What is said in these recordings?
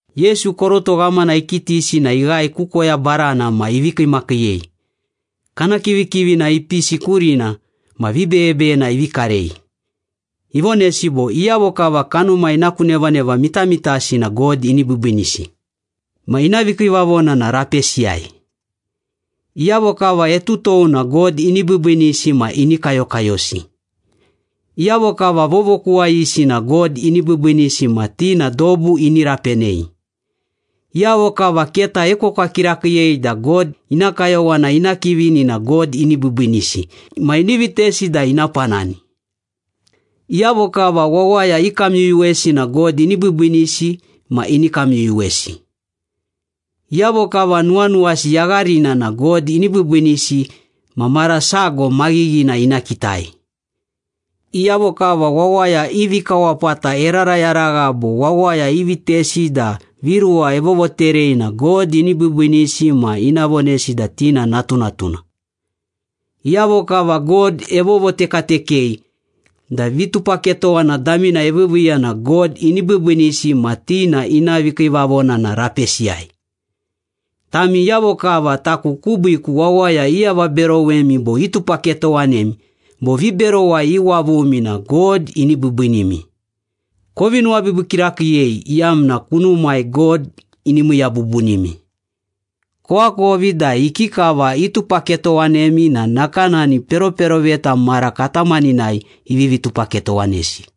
Yesu koroto ghamana ikitisi na ighae ku koya barana ma ivi kiimakiiyei. Kana kivikivina ipisi kurina ma vibeyebeyena ivi karei. Ivonesi bo, “Iyavo kava kanuma ina ku nevaneva mitamitasi na God ini biibiinisi ma ina vikiivavona na rapesiyai. Iyavo kava etutou na God ini biibiinisi ma ini kayokayosi. Iyavo kava vovokuwayisi na God ini biibiinisi ma ti na dobu ini rapenei. Iyavo kava keta iekwekwa kirakiiyei da God ina kayowana ina kivini na God ini biibiinisi ma ini vitesi da ina panani. Iyavo kava wawaya ikamyuyuwesi na God ini biibiinisi ma ini kamyuyuwesi. Iyavo kava nuwanuwasi yagharina na God ini biibiinisi ma mara sago maghighina ina kitai. Iyavo kava wawaya i vikawapata erarayaragha bo wawaya ivitesi da viruwa evovoterei na God ini biibiinisi ma ina vonesi da ti na natunatuna. Iyavo kava God evovotekatekei da vitupaketowana damina eviiviiya na God ini biibiinisi ma ti na ina vikiivavona na rapesiyai.” “Tami iyavo kava taku kubiiku wawaya iavaberowemi bo itupaketowanemi bo viberowai iwavumi na God ini biibiinimi. Kovi nuwabiibii kirakiiyei iyamna kunumai God ini miiya bubunimi. Koakovi da ikikava itupaketowanemi na nakanani peroperoveta mara katamaninai ivivi tupaketowanesi.”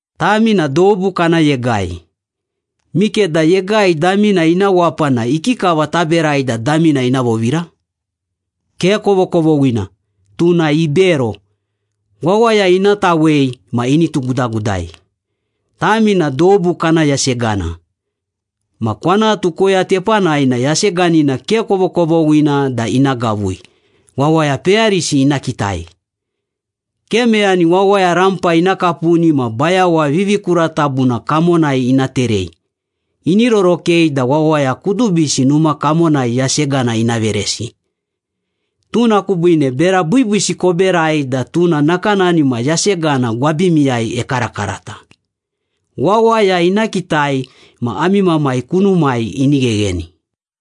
“Tami na dobu kana yegai. Mikeda yegai damina ina wapa na ikikava taberai da damina ina vovira? Ke kovokovoghina. Tuna ibero, wawaya ina tawei ma ini tugudagudai.” “Tami na dobu kana yasegana. Ma kwanatu koya tepanai na yaseganina ke kovokovoghina da ina gavui, wawaya peyarisi ina kitai. Ke meyani wawaya rampa ina kapuni ma bayawa vivikuratabuna kamonai ina terei. Ini rorokei da wawaya kudubisi numa kamonai yasegana ina veresi. Tuna kubiine bera biibiisi koberai da tuna nakanani ma yasegana gwabimiwai ekarakarata. Wawaya ina kitai ma ami Mamai kunumai ini ghegheni.”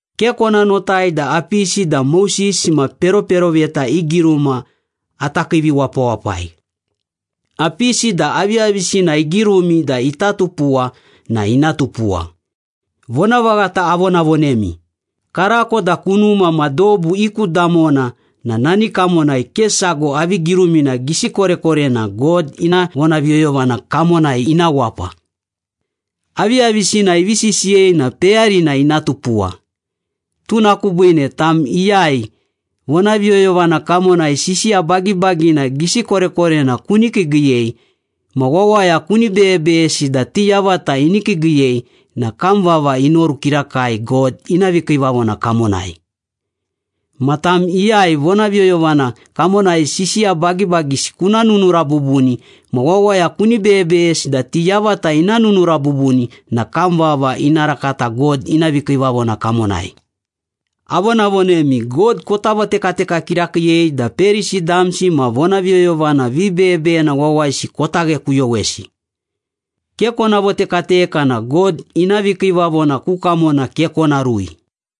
“Ke kona notai da apisi da Moses ma peroperoveta i giruma ata kiiviwapawapai. Apisi da aviyavisina igirumi da ita tupuwa na ina tupuwa. Vonavaghata avonavonemi, karako da kunuma ma dobu i ku damona na nani kamonai ke sago avi girumina gisi korekorena God ina vonaviyoyovana kamonai ina wapa. Aviyavisina ivi sisiyei na peyarina ina tupuwa. Tuna kubiine tam iyai vonaviyoyovana kamonai sisiya bagibagina gisi korekorena kuni kiigiiyei, ma wawaya kuni beyebeyesi da ti yavata ini kiigiiyei na kam vava inoru kirakai God ina vikiivavona kamonai. Ma tam iyai vonaviyoyovana kamonai sisiya bagibagisi kuna nunura bubuni ma wawaya kuni beyebeyesi da ti yavata ina nunura bubuni na kam vava ina rakata God ina vikiivavona kamonai. Avonavonemi, God kota votekateka kirakiiyei da Perisi damsi ma vonaviyoyovana vibeyebeyena wawayisi kota ghekuyowesi. Ke kona votekateka na God ina vikiivavona ku kamona ke kona rui.”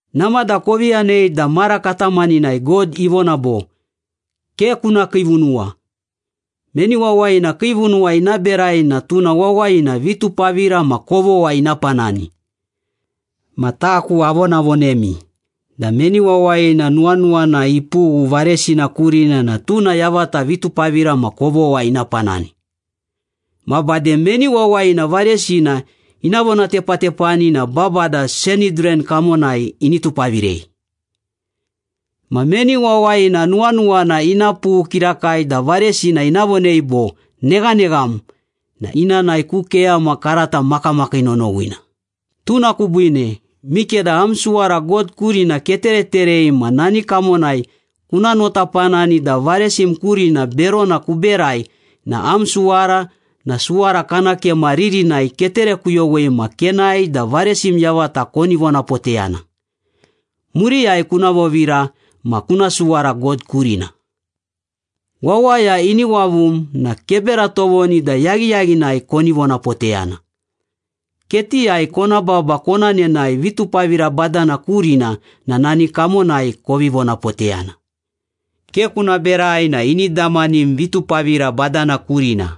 “Namada kovi yanei da mara katamaninai God ivona bo, ‘Ke kuna kiivunuwa. Meni wawayina kiivunuwa ina berai na tuna wawayina vitupavira ma kovogha ina panani.’ Ma taku avonavonemi da meni wawayina nuwanuwana ipughu varesina kurina na tuna yavata vitupavira ma kovogha ina panani. Ma bade, meni wawayina varesina ina vonatepatepani na babada Sanhidran kamonai ini tupavirei. Ma meni wawayina nuwanuwana ina pughu kirakai da varesina ina vonei bo, ‘Neghanegham!’ na ina nae ku keyama karata makamakii nonowina. Tuna kubiine, mikeda am suwara God kurina ketereterei ma nani kamonai kuna notapanani da varesim kurina berona kuberai na am suwara na suwara kana kema ririnai keterekuyowei ma kenae da varesim yavata koni vonapoteyana. Muriyai kuna vovira ma kuna suwara God kurina.” “Wawaya ini wavum na kebera tovoni da yaghiyaghinai koni vonapoteyana. Ketiyai kona baba kona nenae vitupavira badana kurina na nani kamonai kovi vonapoteyana. Ke kuna berai na ini damanim vitupavira badana kurina.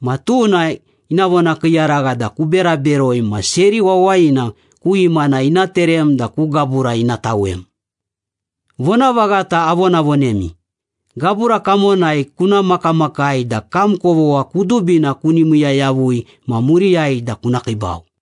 Ma tuna ina vonakiiyaragha da kubera beroi ma seri wawayina ku imana ina terem da ku gabura ina tawem. Vonavaghata avonavonemi, gabura kamonai kuna makamakai da kam kovogha kudubina kuni miiya yavui ma muriyai da kuna kiibau.”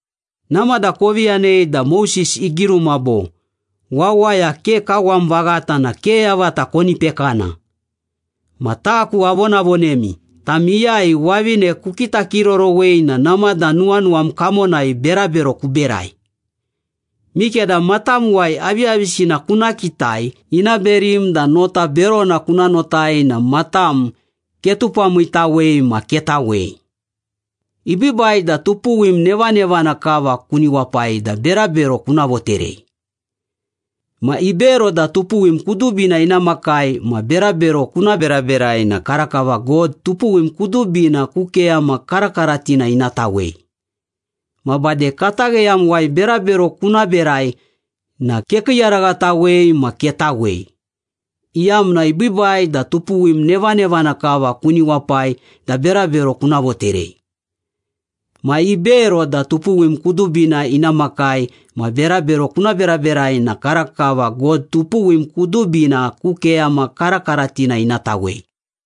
“Namada kovi yanei da Moses igiruma bo, ‘Wawaya ke kawam vaghata na ke yavata koni pekana.’ Ma taku avonavonemi, tam iyai wavine kukitakirorowei na namada nuwanuwam kamonai berabero kuberai. Mikeda matamuwai aviyavisina kuna kitai ina berim da nota berona kuna notai na matam ketupamiitawei ma ketawei. Ibiibai da tupuwim nevanevana kava kuni wapai da berabero kuna voterei. Ma ibero da tupuwim kudubina ina makai ma berabero kuna beraberai na karakava God tupuwim kudubina ku keyama karakaratina ina tawei. Ma bade katagheyamuwai berabero kuna berai na kekiiyaraghatawei ma ketawei, iyamna ibiibai da tupuwim nevanevana kava kuni wapai da berabero kuna voterei. Ma ibero da tupuwim kudubina ina makai ma berabero kuna beraberai na karakava God tupuwim kudubina ku keyama karakaratina ina tawei.”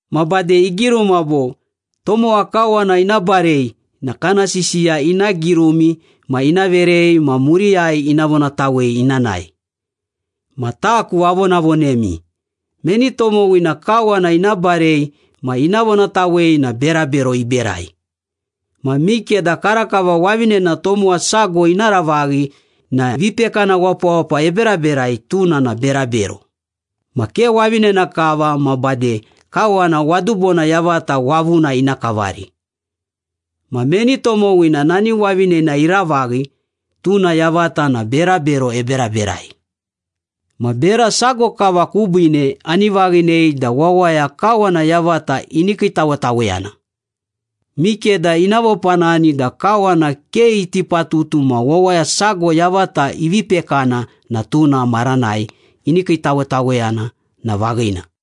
“Ma bade igiruma bo, ‘Tomowa kawana ina barei na kana sisiya ina girumi ma ina verei ma muriyai ina vonatawei ina nae.’ Ma taku avonavonemi, meni tomowina kawana ina barei ma ina vonatawei na berabero iberai. Ma mikeda karakava wavinena tomowa sago ina ravaghi na vipekana wapawapa eberaberai, tuna na berabero. Ma ke wavinena kava ma bade kawana wadubona yavata wavuna ina kavari. Ma meni tomowina nani wavinena iravaghi, tuna yavata na berabero eberaberai. Ma bera sago kava kubiine ani vaghinei da wawaya kawana yavata ini kiitawetaweyana. Mikeda ina vopanani da kawana ke iti patutu ma wawaya sago yavata ivi pekana na tuna maranai ini kiitawetaweyana na vaghina.”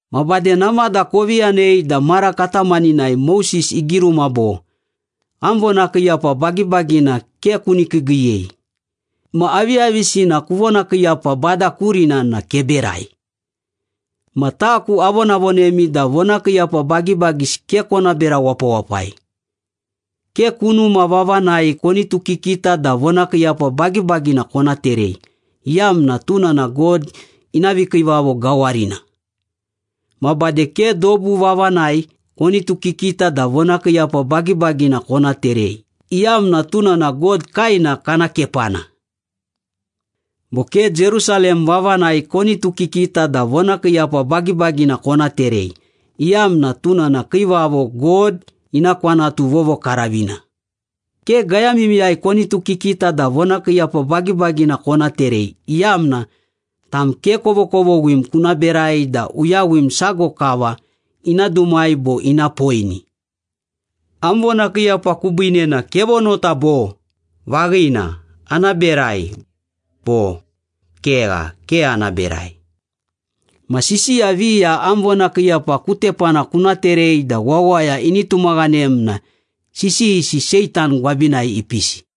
“Ma bade namada kovi yanei da mara katamaninai Moses igiruma bo, ‘Am vonakiiyapa bagibagina ke kuni kiigiiyei. Ma aviyavisina kuvonakiiyapa Bada kurina na keberai.’ Ma taku avonavonemi da vonakiiyapa bagibagisi ke kona bera wapawapai. Ke kunuma vavanai konitukikita da vonakiiyapa bagibagina kona terei, iyamna tuna na God ina vikiivavo gawarina. Ma bade ke dobu vavanai konitukikita da vonakiiyapa bagibagina kona terei, iyamna tuna na God kaena kana kepana. Bo ke Jerusalem vavanai konitukikita da vonakiiyapa bagibagina kona terei, iyamna tuna na Kiivavo God ina kwanatu vovokaravina. Ke gayamimiyai konitukikita da vonakiiyapa bagibagina kona terei, iyamna tam ke kovokovoghim kuna berai da uyawim sago kava ina dumai bo ina poini. Am vonakiiyapa kubiine na kevonota bo, ‘Vaghina, ana berai.’ Bo, ‘Kegha, ke ana berai.’ Ma sisiya viya am vonakiiyapa ku tepana kuna terei da wawaya ini tumaghanem na sisiyisi Seitan gwabinai ipisi.”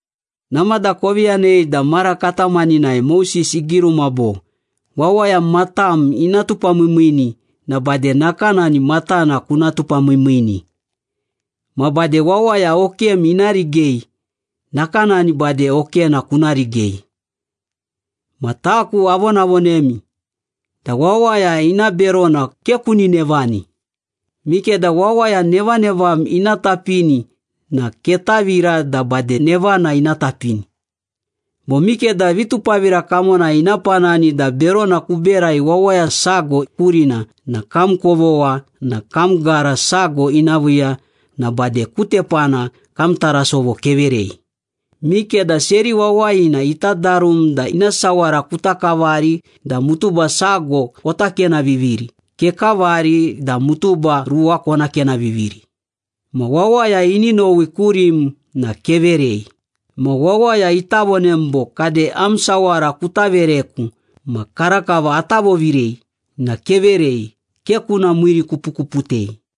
“Namada kovi yanei da mara katamaninai Moses igiruma bo, ‘Wawaya matam ina tupamiimiini na bade nakanani matana kuna tupamiimiini. Ma bade wawaya okem ina rigei, nakanani bade okena kuna rigei.’ Ma taku avonavonemi da wawaya ina berona ke kuni nevani. Mikeda wawaya nevanevam ina tapini na ketavira da bade nevana ina tapini. Bo mikeda vitupavira kamonai ina panani da berona kuberai wawaya sago kurina na kam kovogha na kam gara sago ina viiya na bade ku tepana kam tarasovo keverei. Mikeda seri wawayina ita darum da ina sawara kuta kavari da mutuba sago kota kenaviviri, kekavari da mutuba ruwa kona kenaviviri. Ma wawaya ini nowi kurim na keverei. Ma wawaya ita vonem bo, ‘Kade am sawara kuta vereku ma karakava ata vovirei’ na keverei, ke kuna miirikupukuputei.”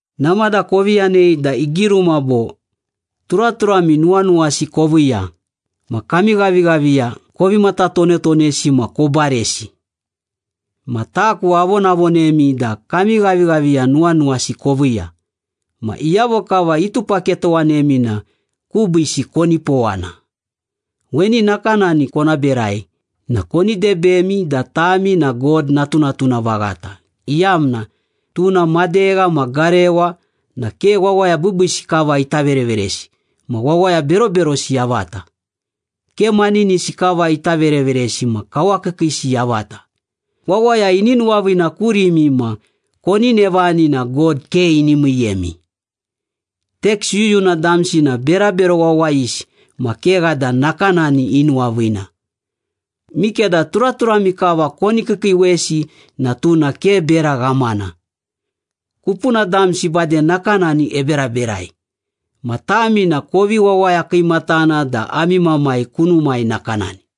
“Namada kovi yanei da igiruma bo, ‘Turaturami nuwanuwasi koviiya, ma kami ghavighaviya kovi matatonetonesi ma kobaresi.’ Ma taku avonavonemi da kami ghavighaviya nuwanuwasi koviiya, ma iyavo kava itupaketowanemi na kubiisi konipowana. Weni nakanani kona berai na koni debemi da tami God natunatuna vaghata, iyamna tuna madegha ma garewa na ke wawaya biibiisi kava ita vereveresi ma wawaya beroberosi yavata. Ke maninisi kava ita vereveresi ma kawakiikiisi yavata. Wawaya ini nuwaviina kurimi ma koni nevani na God ke ini miiyemi. Teks yuyuna damsi na berabero wawayisi ma kegha da nakanani inuwaviina. Mikeda turaturami kava koni kiikiiwesi na tuna ke bera ghamana. Kupuna damsi bade nakanani eberaberai. Ma tami na kovi wawaya kiimatana da ami Mamai kunumai nakanani.”